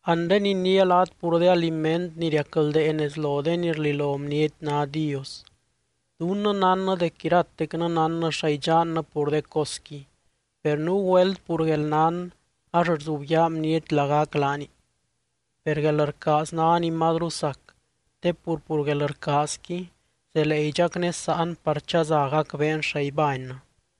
Anre iniia laat pur de aliment ni riacldee nez lo de ni rlilo bniety ná dios. Dunnɨ nánnɨ dec iratecnɨ nánnɨ xa idxannɨ pur de cosqui, per nuu güelt pur guelnán ax rzubyaa bniety lagac laani. Per guelrcaaz ná ni mazru sac, te pur, pur guelrcaazqui zelee idxacnésaan par chaza gacbeen xa ibánnɨ.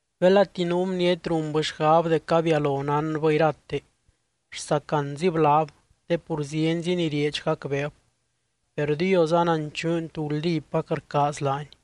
Belati nuu bniety runbɨ xgab dec abialo nánbɨ irate, rsacanzib laab te pur zienzi ni rieedx gacbeeb. Per Dios ananchuuny tú guldípac rcaaz laany.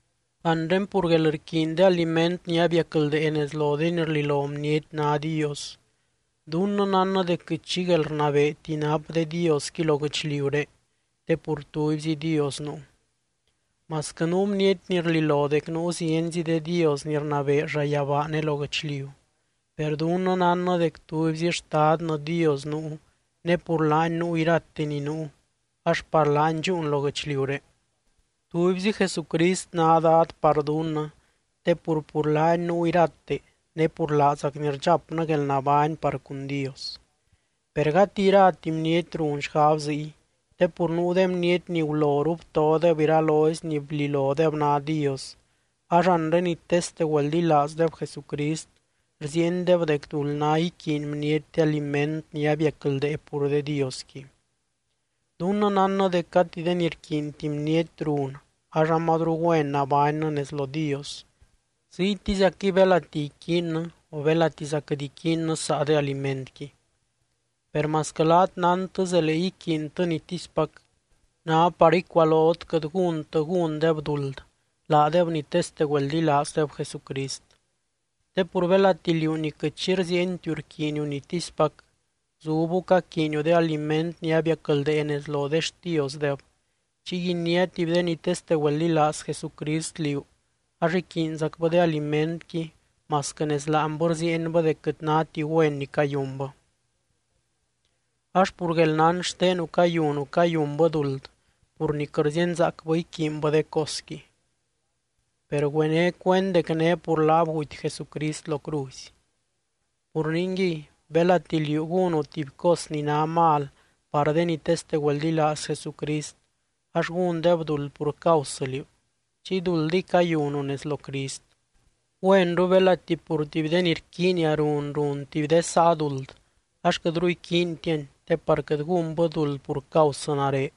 Anre pur guelrquiiny de aliment ni abiacldee nez lo de ni rlilo bniety ná dios, dunnɨ nánnɨ dec quɨt xi guelrnabeeti nap de diosqui lo guɨchliuré, te pur tubyzi Dios nuu. Masquɨ nuu bniety ni rlilo dec nuu zienzi de dios ni rnabee llayabaa ne lo guɨchliu, per dunnɨ nánnɨ dec tubyzi Xtadnɨ Dios nuu ne pur laany nuu irate ni nuu ax par laany dxúun lo guɨchliuré. Tubyzi Jesucrist ná Dad par dunnɨ te pur, pur laany nuu irate ne pur laazacny rdxapnɨ guelnabány par cun Dios. Per gati irati bniety run xgab ziy. Te pur nuu de bniety ni guloru btodeb iralozy ni blilodeb ná dios, ax anre ni teste güeldilaazdeb Jesucrist rziiendeb dec duld ná iquiiny bniety de aliment ni abiacldee pur de diosqui. Dunnɨ nánnɨ dec gati de ni rquiinti bniety run ax amazru güen nabánybɨ nez lo Dios, ziytiziacquɨy belati iquiinnɨ o belatiza quɨt iquiinnɨ saa de alimentqui. Per masquɨ laat nántɨ zelee iquiintɨ nitispac, ná par icualot quɨt gúntɨ gúndeb duld laadeb ni teste güeldilaazdeb Jesucrist. Te pur belati liú ni quɨt xi rziientiu iquiiniu nitispac, zubbu caquiiniu de aliment ni abiacldee nez lo de xtiosdeb, chiy iniá tuby de ni teste güeldilaaz Jesucrist liú ax iquiinzacbɨ de alimentqui masquɨ nez láanbɨ rziienbɨ dec quɨt náti güen ni cayunbɨ. Ax pur guelnán xtenu cayunu cayunbɨ duld pur ni quɨt rzíenzaacbɨ iquiinbɨ de cosqui, per güené cuend dec né pur laab guty Jesucrist lo cruzy. Pur ningui, belati liú gúnu tuby cos ni ná mal par de ni teste güeldilaaz Jesucrist ax gúndeb duld pur causɨ liú, chiy duldiy cayunu nez lo Crist. Güenru belati pur tuby de ni rquiinia run, run tuby de saa duld ax quɨtru iquiintiani te par quɨt gúnbɨ duld pur causɨ nare.